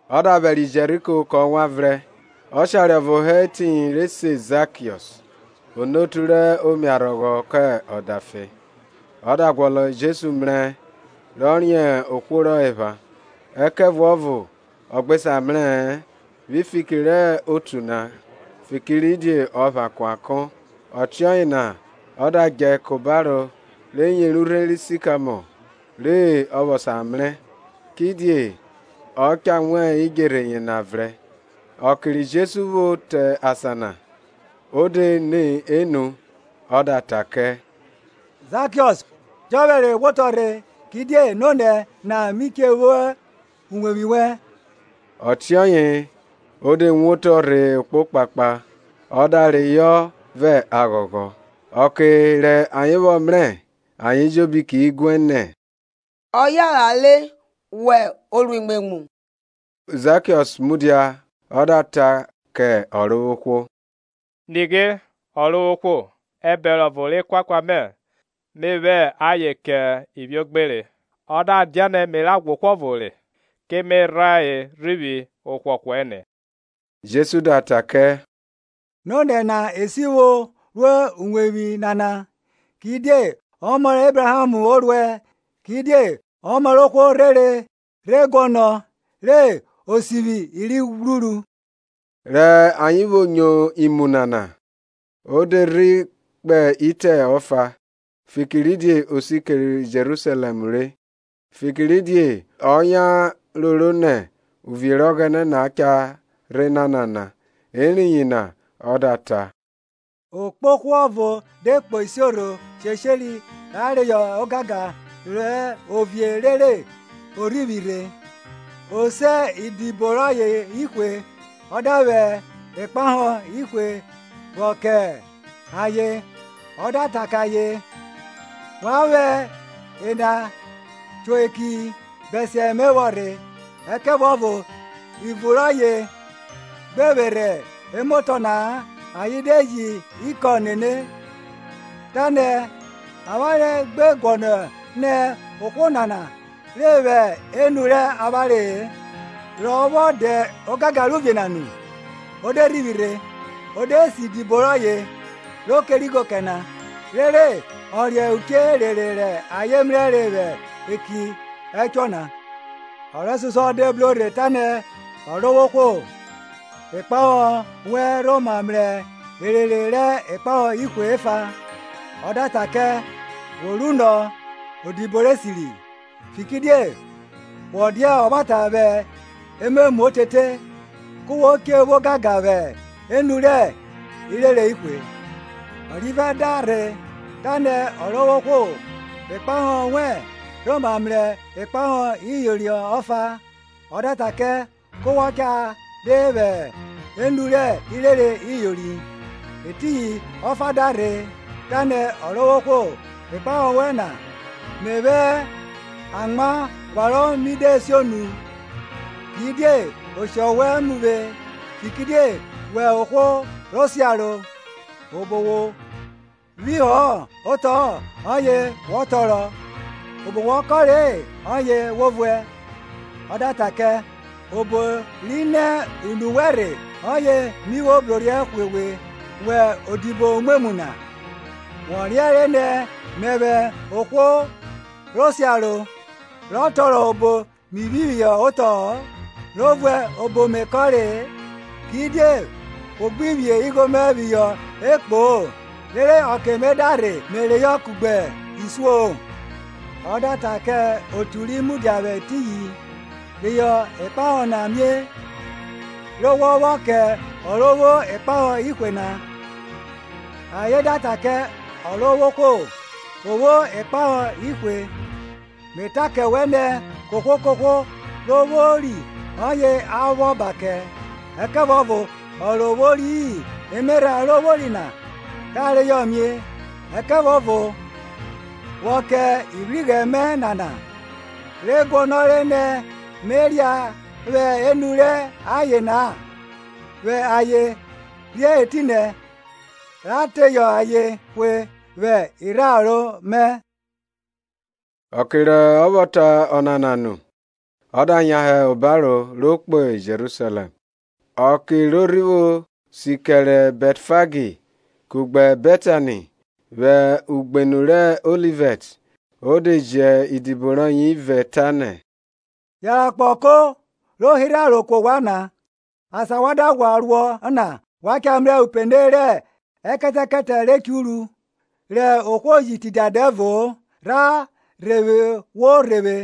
Ọ da vwẹriẹ Jeriko kọ wanvrẹn. Ọshare ọvo hẹ etiyin re se Zakiọs; onotu rẹ imiarhọghọ, kẹ ọdafe. Ọ da guọnọ Jesu mrẹ rọ riẹn ohwo rọ epha, ẹkẹvuọvo ọ gbe sa mrẹ-ẹ vwi fiki rẹ otu na, fikiridie ọ pha kuankọ. Ọtiọye na ọ da djẹ ka obaro re yeri urhe ri sikamọ re ọ vwọ sa mrẹ, kidie ọ cha wan idjerhe yena vrẹn. Ọke ri Jesu rhi vwo te asan na, o de ni enu ọ da ta kẹ, Zakiọs, jọphẹre wo woto rhe; kidie nonẹ na mi che wo uwevwi wẹn. Ọtiọye o de wotọ rhe okpokpakpa, ọ da reyọ vẹ aghọghọ. Ọke rẹ ayen vwọ mrẹ ayen ejobi ki guẹ nẹ, Ọ yanran re wo oruimwemwu. Zakiọs mudia ọ da ta kẹ Ọrovwohwo, Nighe, Ọrovwohwo, abọvo rẹ ekuakua mẹ me vwẹ ayen kẹ ivwiogbere; ọ da dianẹ me rha ghwa ohwo ọvo re, ke me rhan rhivwi ọhwọhwọ ẹne. Jesu da ta kẹ, Nonẹ na esivwo ro uwevwi nana, kidie ọmọ rẹ Ebraham o ruẹ. Kidie Ọmọ rẹ ohwo rhere rhe guọnọ re o sivwi i ri ghwruru. Rẹ ayen vwo nyo imu nana, o de rhe kpe itẹ ọfa, fikiridie o si kẹrẹ Jerusalẹm re, fikiridie ayen roro nẹ uvie rẹ Ọghẹnẹ na cha rhe nanana. Eriyin na ọ da ta, Okpohwo ọvo de kpo isiorho shesheri ra reyọ ogangan rẹ ovie rere ọ rhivwi rhe. O se idibo rọye ihwe, ọ da vwẹ ikpaho ihwe vwọ kẹ ayen, ọ da ta kẹ ayen, Wa vwẹ ena cho eki bẹsiẹ me vwọ rhe. Ẹkẹvuọvo ivun rọye gbe vwerhe emotọ na-a ayen de ji ikọn nene, tanẹ, Avwanre gbe guọnọ nẹ ohwo nana re vwẹ enu rẹ avwanre-e. Rọ vwọ dẹ ogangan rẹ ovie na nu, o de rhivwi rhe, o de se idibo rọye, ro kere igho kẹ na, rere ọ riẹn uche erere rẹ ayen mrẹre vwẹ eki ẹchuọ na. Ọ rẹsosuọ de bro rhe tanẹ, Ọrovwohwo, ikpahọ wẹn rhoma mrẹ erere rẹ ikpahọ ihwe ọfa. Ọ da ta kẹ, Wo runọ, odibo rẹ esiri! Fikiridie wọ dia ọvwata vwẹ ememu otete, ku wo che vwo ogangan vwẹ enu rẹ irere ihwe. Ọrivẹ da rhe, tanẹ, Ọrovwohwo, ikpahọ, wẹn rhoma mrẹ ikpahọ iyori ọfa. Ọ da ta kẹ, ku wọ cha re vwẹ enu rẹ irere iyori. Etiyin ọfa da rhe, tanẹ, Ọrovwohwo, ikpahọ wẹn na, me vwẹ amwa pharọ mi de sionu; kidie oshọ wẹ mu vwe, fikiridie wẹ ohwo ro siaro; obo wo phihọ otọ-ọ ọye wọ tọrọ, obo wọ kọnre-e ọye wo vuẹ. Ọ da ta kẹ, obo ri nẹ unu wẹn rhe ọye mi vwo brorhiẹ hwe we wẹ odibo umwemwu na! Wọ riẹnre nẹ mẹvwẹ ohwo ro siaro, rọ tọrọ obo mi phihọ otọ-ọ, ro vuẹ obo Me kọnre-e? Kidie wo gbi phi igho mẹ phihọ ekpo-o, rere ọke me da rhe me reyọ kugbe isuo-o? Ọ da ta kẹ otu ri mudia vwẹ etiyin, Reyọ ikpahọ na mie, re wọ vwọ kẹ ọ ro vwo ikpahọ ihwe na. (Ayen da ta kẹ, Ọrovwohwo, o vwo ikpahọ ihwe!) Me ta kẹ wẹ nẹ, kohwo kohwo ro vwori ọye a vwọ ba kẹ; ẹkẹvuọvo ọ ro vwori-i, emerha ro vwori na ka reyọ mie. Ẹkẹvuọvo vwọ kẹ ivwighrẹ mẹ nana, re guọnọre nẹ me ria vwẹ enu rẹ aye-en na, vwẹ ayen rhe etinẹ ra teyọ ayen hwe vwẹ irharo mẹ. Ọke ro vwọ ta ọnana nu, ọ da yan hẹ obaro, ro kpo Jerusalẹm. Ọke ro rhi vwo si kẹre Bẹtfagi kugbe Bẹtani, vwẹ ugbenu re se Ọlivẹt, o de ji idibo rọye ivẹ, tanẹ Yanran kpo ọko ro hirhe aro ku ovwan na, asan wa da ghwa ruọ na wa cha mrẹ upene rẹ ekẹtẹkẹtẹ re churu, rẹ ohwo ji tidia dẹvo-o; rhan re vwo rhe vwe.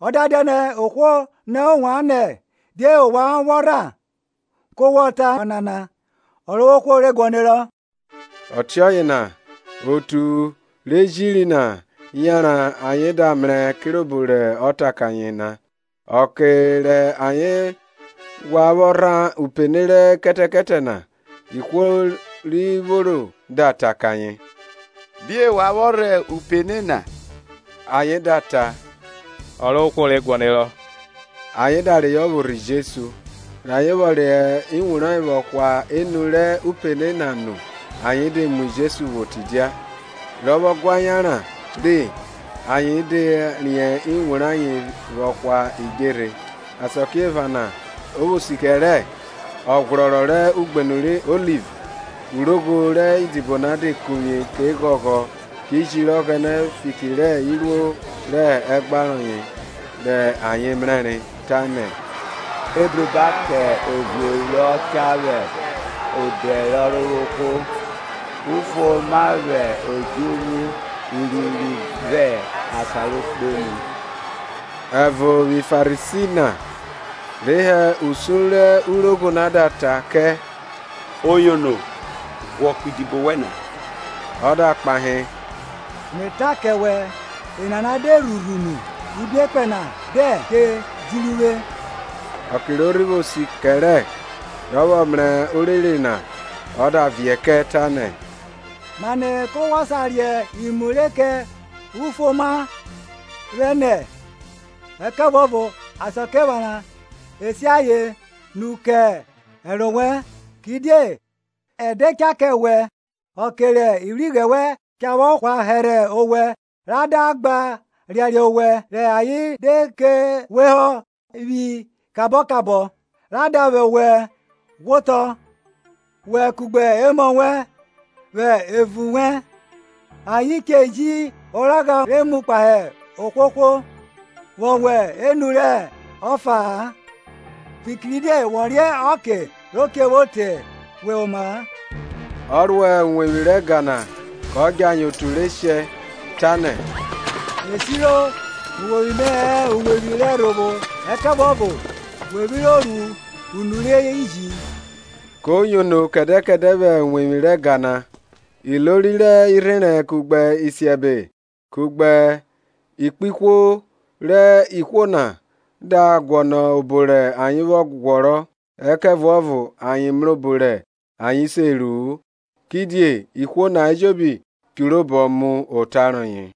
Ọ da dianẹ ohwo nọ ovwan nẹ, Die ovwan vwọ rhan? ku wọ ta ọnana, Ọrovwohwo re guọnerọ. Ọtiọye na otu re jiri na yanran ayen da mrẹ kirobo rọ ta kẹ ayen na. Ọke rẹ ayen ghwa vwọ rhan upene rẹ ekẹtẹkẹtẹ na, ihwo ri vworo da ta kẹ ayen, Die wa vwọ rhan upene na? Ayen da ta, Ọrovwohwo re guọnerọ. Ayen da reyọ vwo rhe Jesu, rẹ ayen vwọ vwẹ iwun rayen vwọ hwa enu rẹ upene na nu ayen de mu Jesu vwo tidia. Rọ vwọ gua yanran re, ayen da riẹn iwun rayen vwọ hwa idjerhe. Asakiephana ro vwo siẹ kẹrẹ, ọghwrọrọ rẹ Ugbenn rẹ Oliv urogho rẹ idibo na de kuvwie, ke ghọghọ ki jiri Ọghẹnẹ fiki rẹ iruo rẹ ẹgba rọye rẹ ayen mrẹre, tanẹ, Ebruba kẹ Ovie rọ cha vwẹ odẹ rẹ Ọrovwohwo! Ufuoma vwẹ odjuvwu urinrin vwẹ asan ro kpenu! Ẹvo vwi Farisi na re hẹ usun rẹ urogho na da ta kẹ, Oyono, ghwọ ku idibo wẹn na. Ọ da kpahe, Me ta kẹ wẹ, enana de rhurhu unu, ibiekpẹn na dẹn che jiri uvwe. Ọke ro rhi vwo si kẹrẹ rọ vwọ mrẹ orere na ọ da viẹ kẹ, tanẹ, Mane ku wọ sa riẹn imu re kẹ ufuoma vwenẹ! Ẹkẹvuọvo Asakiephana e si ayen nu kẹ ẹro wẹn. Kidie ẹdẹ cha kẹ wẹ, ọke rẹ ivwighrẹ wẹn cha vwọ hwa hẹrhẹ owẹ re da gba riariẹ owẹ, rẹ ayen de ke we họ vwi kabọ kabọ, ra da vwẹ owẹ ghwiotọ, wẹ kugbe emọ wẹn vwẹ evun wẹn, ayen che ji oragha re mu kpahe ohwohwo vwo vwẹ enu rẹ ọfa-a; fikiridie wọ riẹn ọke ro che vwo te we oma-a. Ọ ro uwevwi rẹ ẹga na kọ djẹ ayen otu re shẹ, tanẹ, E siro, Uwevwi mẹ hẹ uwevwi rẹ ẹrhovwo; ẹkẹvuọvo we vwiro ru unu rẹ iji. Ko yono kẹdẹ kẹdẹ vwẹ uwevwi rẹ ẹga na. Ilori rẹ irherẹn kugbe isiẹbe kugbe ikpihwo rẹ ihwo na da guọnọ obo rẹ ayen vwọ ghwọrọ; ẹkẹvuọvo ayen mrẹ obo rẹ ayen se ru-u, kidie ihwo na ejobi churu obọ mu ota rọye.